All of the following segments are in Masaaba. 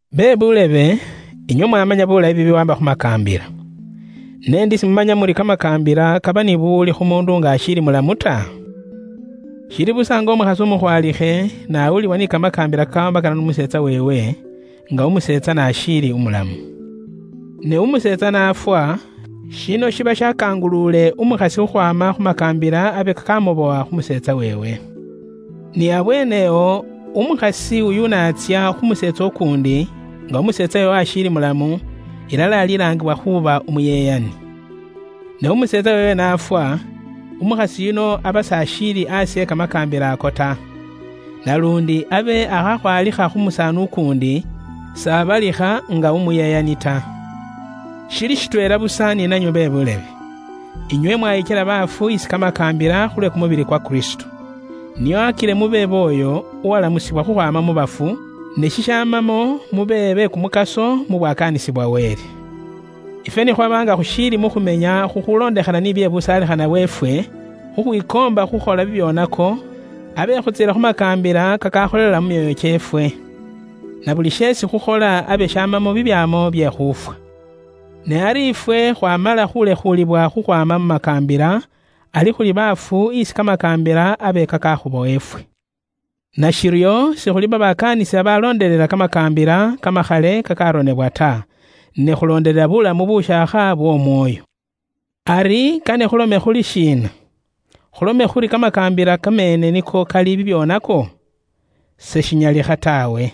Bebuulebe, inywe mwamanya buulayi bibiwaamba khu makaambila. Ne ndi simumanya muri kamakaambila kaba ni buwuli khu muundu nga ashiili umulamu ta? Shili busa nga umukhasi umukhwaalikhe n'awulibwa ni kamakaambila kakawaambakana n'umuseetsa weewe nga umuseetsa n'ashiili umulamu. Ne umuseetsa n'afwa, shino shiba shakanguluule umukhasi khukhwaama khu makaambila abe kakamubowa khu museetsa weewe. Ni abweene awo, umukhasi uyu n'atsya khu museetsa ukuundi nga umuseetsa weewe ashiili umulamu, ilala alilaangibwa khuuba umuyeyani. Ne umuseetsa weewe n'afwa, umukhasi yuno aba s'ashiili aasi e kamakaambila ako ta. Naluundi abe akhakhwaalikha khu musaani ukuundi, s'abalikha nga umuyeyani ta. Shili shitweela busa ni nanywe be buulebe. Inywe mwayikyela baafu isi kamakaambila khulwe kumubili kwa Kristo, nio akile mube b'oyo, uwalamusibwa khukhwaama mu bafu, ne shishamamo mube be kumukaso mu bwakaanisi bwa Wele. Ifwe ni khwaba nga khushiili mu khumenya khukhulondekhana ni busaalikhana bwe kimibili kyeefwe nga ni kili, khukhwikoomba khukhola bibyoonako, abe khutsiila khu makaambila kakakholela mu myoyo kyeefwe. Na buli sheesi khukhola abe shamamo bibyaamo bye khuufwa. Ne ari ifwe khwaamala khuulekhuulibwa khukhwaama mu makaambila, ari khuli baafu isi kamakaambila abe kakakhubowa ifwe. Nashiryo sikhuli babakaanisi babaloondelela kamakaambila kamakhale kakaronebwa ta, ne khulondelela buulamu bushaakha bw'Omwoyo. Ari kane khulome khuri shiina? Khulome khuri kamakaambila kameene niko kali bibyoonako? Seshinyalikha taawe.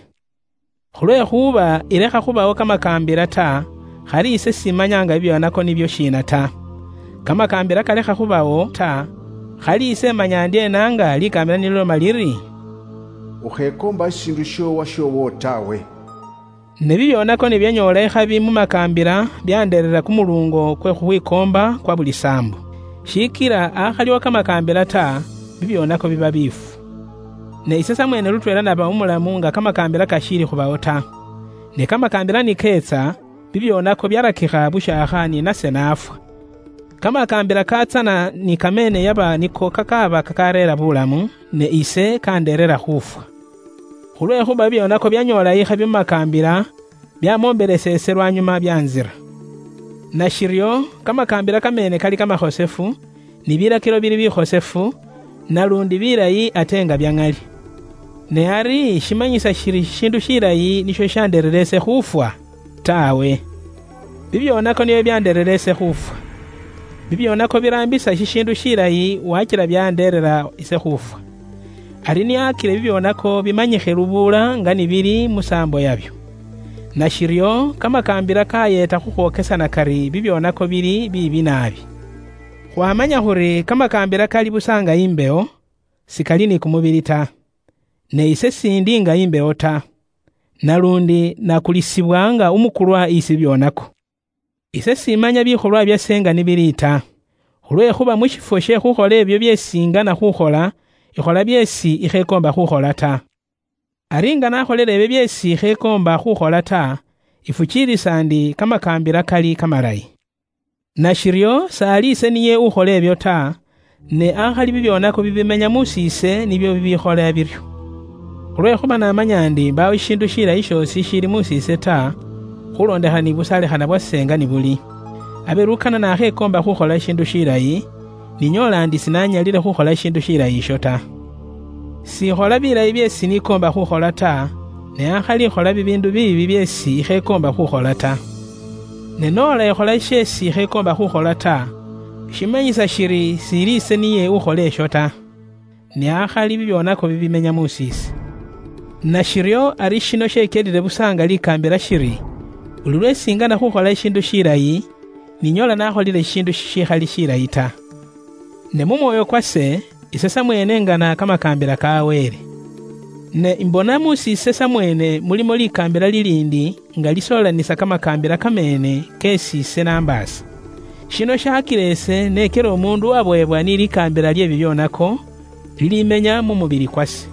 Khulwekhuuba ilekha khubawo kamakaambila ta, khali ise simanya nga bibyoonako nibyo shiina ta. Kamakaambila kalekha khubawo ta, khali ise imanya indyeena nga likaambila ni liloma liri, “Ukhekoomba shishiindu sh'owashoowo taawe?” Ne bibyoonako ni byanyoola ikhabi mu makaambila byandereera kumuluungo kwe khukhwikoomba khwa buli saambo. Shikila akhaliwo kamakaambila ta, bibyoonako biba biifu. Ne ise samweene lutweela naba umulamu nga kamakaambila kashiili khubawo ta. Ne kamakaambila ni keetsa, bibyoonako byarakikha bushaakha ni nase naafwa. Kamakaambila katsana ni kameene yaba niko kakaaba kakareera buulamu, ne ise kandereera khufwa. Khulwekhuuba bibyoonako byanyoola ikhabi mu makaambila, byamombelesa ise lwanyuma byantsira. Nashiryo, kamakaambila kameene kali kamakhosefu, ni bilakilo bili bikhosefu, naluundi bilayi ate nga bya ŋali. Ne ari shimanyisa shiri shishiindu shilayi nisho shishandereera ise khuufwa? Taawe. Bubwoonaki nibwo bubwandeerera ise khufwa. Bubwoonaki buraambisa shishiindu shilayi wakila bwandereera ise khuufwa, ari nio akile bubwoonaki bumanyikhe lubuula nga ni buli mu saambo yabwo. Nashiryo kamakaambila kayeeta khukhwokesana kari bubwoonaki buli shiibi she angaaki naabi. Khwaamanya khuri kamakaambila kali busa nga imbewo, sikali ni kumubili ta. Ne ise s'indi nga imbewo ta. Naluundi nakulisibwa nga umukulwa isi bibyoonako. Ise simanya bikholwa byase nga ni bili ta. Khulwekhuuba mu shifwo she khukhola ibyo byeesi ingana khukhola, ikhola byeesi ikhekoomba khukhola ta. Ari nga nakholile ibyo byeesi ikhekoomba khukhola ta, ifukiilisa ndi kamakaambila kali kamalayi. Nashiryo s'ali ise niye ukhola ibyo ta, ne akhali bibyoonako bibiimenya mus'iise nibyo bibikhola biryo. Khulwekhuuba ise namanya ndi mbaawo shishiindu shilayi shoosi shishiili mus'iise ta; khulondekhana ni busaalikhana bwe kumubili kwase nga ni kuli. Abe lukana nakhekoomba khukhola shishiindu shilayi, ninyoola ndi sinanyalile khukhola shishiindu shilayi isho ta. S'ikhola bilayi byeesi nikoomba khukhola ta, ne akhali ikhola bibiindu biibi byeesi ikhekoomba khukhola ta. Ne noola ikhola sheesi ikhekoomba khukhola ta, shimanyisa shiri s'ili ise niye ukhola isho ta, ne akhali bibyoonako bibiimenya mus'iise. Nashiryo ari shino shekyelile busa nga likaambila shiri, buli lweesi ingana khukhola shishiindu shilayi, ninyoola nakholile shishiindu shishikhali shilayi ta. Ne mu mwoyo kwase, ise samweene ingana kamakaambila ka Wele. Ne imbona mus'iise samweene mulimo likaambila liliindi nga lisoolanisa kamakaambila kameene keesi ise nambaasa. Shino shakila ise nekyela umuundu uwabowebwa ni likaambila lye bibyoonako, liliimenya mu mubili kwase.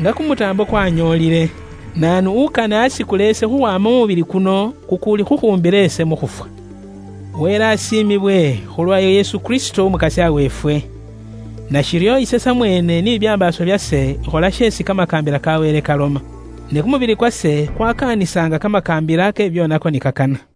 Nga kumutaambo kwanyoolile! Naanu ukane asikule ise khukhwaama mu mubili kuno kukuuli khukhumbila ise mu khufwa? Wele asiimibwe, khulwa Yesu Kristo Umukasya weefwe! Nashiryo ise samweene ni bibyambaaso byase ikhola sheesi kamakaambila ka Wele kaloma. Ne kumubili kwase kwakaanisa nga kamakaambila ke bibyoonako ni kakana.